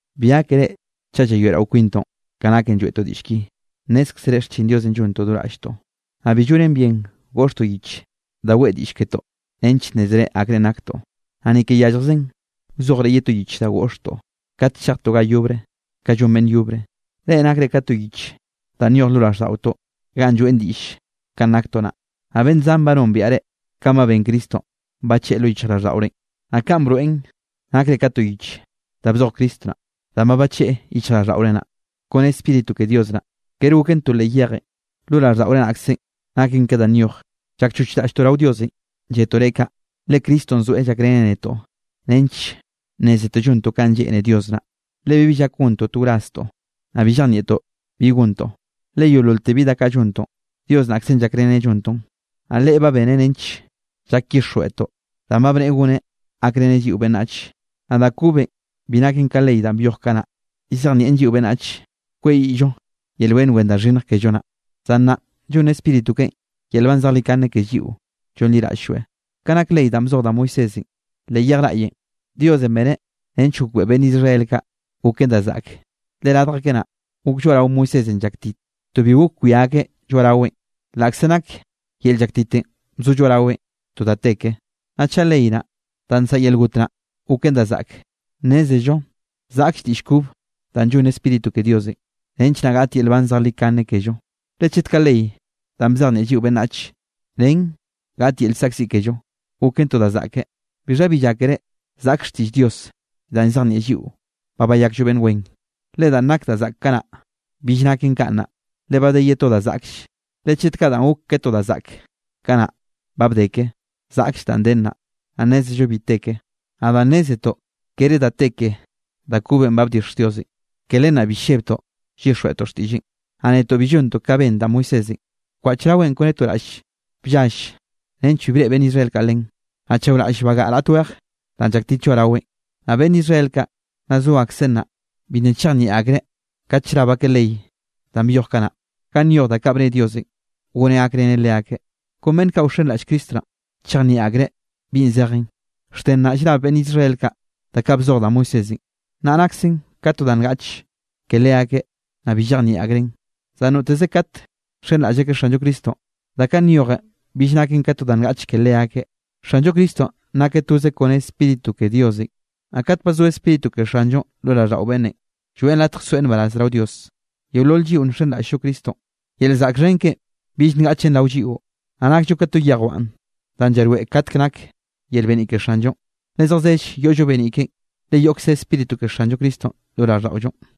Bi gákere chaꞌ llayoeꞌrao kwintoꞌn ka naken lloeꞌtoꞌ diꞌll ki. Nnézkzere xchin Diosenꞌ llontoꞌ do raꞌlltoꞌ, naꞌ bi llonen bien goꞌxtoꞌ yich da weꞌe diꞌll ketoꞌ nench nnézere akrenꞌ naktoꞌ, naꞌ ni ke yalljzen wzojre ye to yich da goꞌxtoꞌ kat chejtoꞌ ga yobre kanꞌ llon beꞌnn yobre. Reꞌ nakre ka to yich danꞌ nyoj lo raꞌlldaꞌotoꞌ ganꞌ lloeꞌn diꞌll kanꞌ naktoꞌ naꞌ. Naꞌ beꞌnn zan ba nombiaꞌ reꞌ, kanꞌ ba ben Cristonꞌ, bacheꞌe lo yichjraꞌlldaꞌorenꞌ. Naꞌ kaꞌn broeꞌn nakre ka to yich da bzoj Cristo naꞌ, danꞌ ba bacheꞌe yichjraꞌlldaꞌore naꞌ, kone Spíritu ke Dios naꞌ. Kere goken to leꞌ yejenꞌ, lo raꞌlldaꞌore nakzen, naken ke da nyoj. Llakchoch raꞌlltoꞌ rao Diosenꞌ lletoꞌ reꞌ kaꞌ, le Cristonꞌ zoeꞌ llakreneꞌ netoꞌ nench nnézetoꞌ llontoꞌ kanꞌ lleꞌne Dios naꞌ. Le bibi llak gontoꞌ to wraztoꞌ, naꞌ bi llejnieꞌtoꞌ bi gontoꞌ, le yeololte bi da kaꞌ llontoꞌn, Dios naꞌkzenꞌ llakreneꞌ llontoꞌn. Naꞌ Leꞌe ba beneꞌ nench llak llyixjweꞌtoꞌ danꞌ ba bneꞌe goneꞌ gakreneꞌ lliꞌo beꞌnnach. Naꞌ da kobenꞌ bi naken ka ley danꞌ byoj kanaꞌ, llzejnieꞌn lliꞌo beꞌnnach kweyiꞌllo yel beꞌnn wen da xhinnj kello naꞌ, zan nnaꞌn llonn Spíritu keꞌen yel nban zejlikane ke lliꞌo llonliraꞌll-lloeꞌ. Ka nak ley danꞌ bzoj da Moisésenꞌ leꞌ yej raꞌyenꞌ, Diosenꞌ beneꞌ nench gokbeꞌe beꞌnn Israel kaꞌ goken da zaꞌke, le radj akeꞌ naꞌ, gok lloaꞌrao Moisésenꞌ llaktit, to bi gok wia akeꞌ lloaꞌraweꞌn, laꞌkze nak yel llaktitenꞌ bzo lloaꞌraweꞌn to da te ke. Naꞌ chaꞌ ley naꞌ, danꞌ nsaꞌa yel got naꞌ goken da zaꞌke, nnézello zaꞌkll diꞌll kob danꞌ llonn Spíritu ke Diosenꞌ, nench naꞌ gaꞌt yel nban zejlikane kello. Le chet kaꞌ ley danꞌ bzejnieꞌ lliꞌo beꞌnnachenꞌ nen gaꞌt yel llzaꞌkziꞌ kello, goken to da zaꞌke, ¿bixha bi llákere zaꞌkll xtiꞌll Dios danꞌ llzejnieꞌn lliꞌo ba bayakllo beꞌnn wen? Le danꞌ nak da zaꞌk kanaꞌ, bill naken kaꞌ nnaꞌ, le ba de ye to da zaꞌklle. Le chet kaꞌ danꞌ gok ke to da zaꞌk kanaꞌ ba bde ke, zaꞌkll danꞌ de nnaꞌ, naꞌ nnézello bi te ke. Naꞌ danꞌ nnézetoꞌ kere da te ke da kobenꞌ ba bdixj Diosenꞌ, ke len naꞌ bi llebtoꞌ llyixjweꞌtoꞌ xtiꞌlleꞌn. Naꞌ netoꞌ bi llontoꞌ kanꞌ ben da Moisésenꞌ, bkwaꞌch raweꞌ kone to raꞌll bllall nench bi breꞌe beꞌnn Israel kaꞌ len, naꞌ chaoraꞌll bagaꞌa raꞌt weje danꞌ llaktit lloaꞌraweꞌn. Naꞌ beꞌnn Israel kaꞌ nna zo akseꞌ nnaꞌ, bi nna chejnieꞌ akreꞌ kat llrab akeꞌ ley danꞌ byoj kanaꞌ, ganꞌ nyoj da kaꞌ bne Diosenꞌ goneꞌ gakreneꞌ leakeꞌ. Kon beꞌnn kaꞌ wxenraꞌll Cristo naꞌ chejnieꞌ akreꞌ bi zejen. Xte nnaꞌ llrab beꞌnn Israel kaꞌ da kaꞌ bzoj da Moisésenꞌ, nna naksen ka to da ngaꞌch ke leakeꞌ naꞌ bi llejnieꞌ akreꞌn. Zan noteze kate nxenraꞌll akeꞌ Xanllo Cristonꞌ, da kaꞌ nyojen bill naken ka to da ngaꞌch ke leakeꞌ. Xanllo Cristonꞌ nakeꞌ toze kone Spíritu ke Diosenꞌ. Naꞌ kat ba zo Spíritu ke Xanllonꞌ lo raꞌlldaꞌo beꞌnne, lloeꞌn latj soeꞌ nbaraz rao Dios. Yeolol lliꞌo nxenraꞌll-llo Cristonꞌ, yel zaꞌk xhen keꞌen bill ngaꞌchen rao lliꞌo, naꞌ nakllo ka to yejwan danꞌ llaroeꞌ katkenꞌ nak yel beniꞌ ke Xanllonꞌ, le zejzell yoꞌllo beniꞌ keꞌen, le yoꞌkze Spíritu ke Xanllo Cristonꞌ lo raꞌlldaꞌollonꞌ.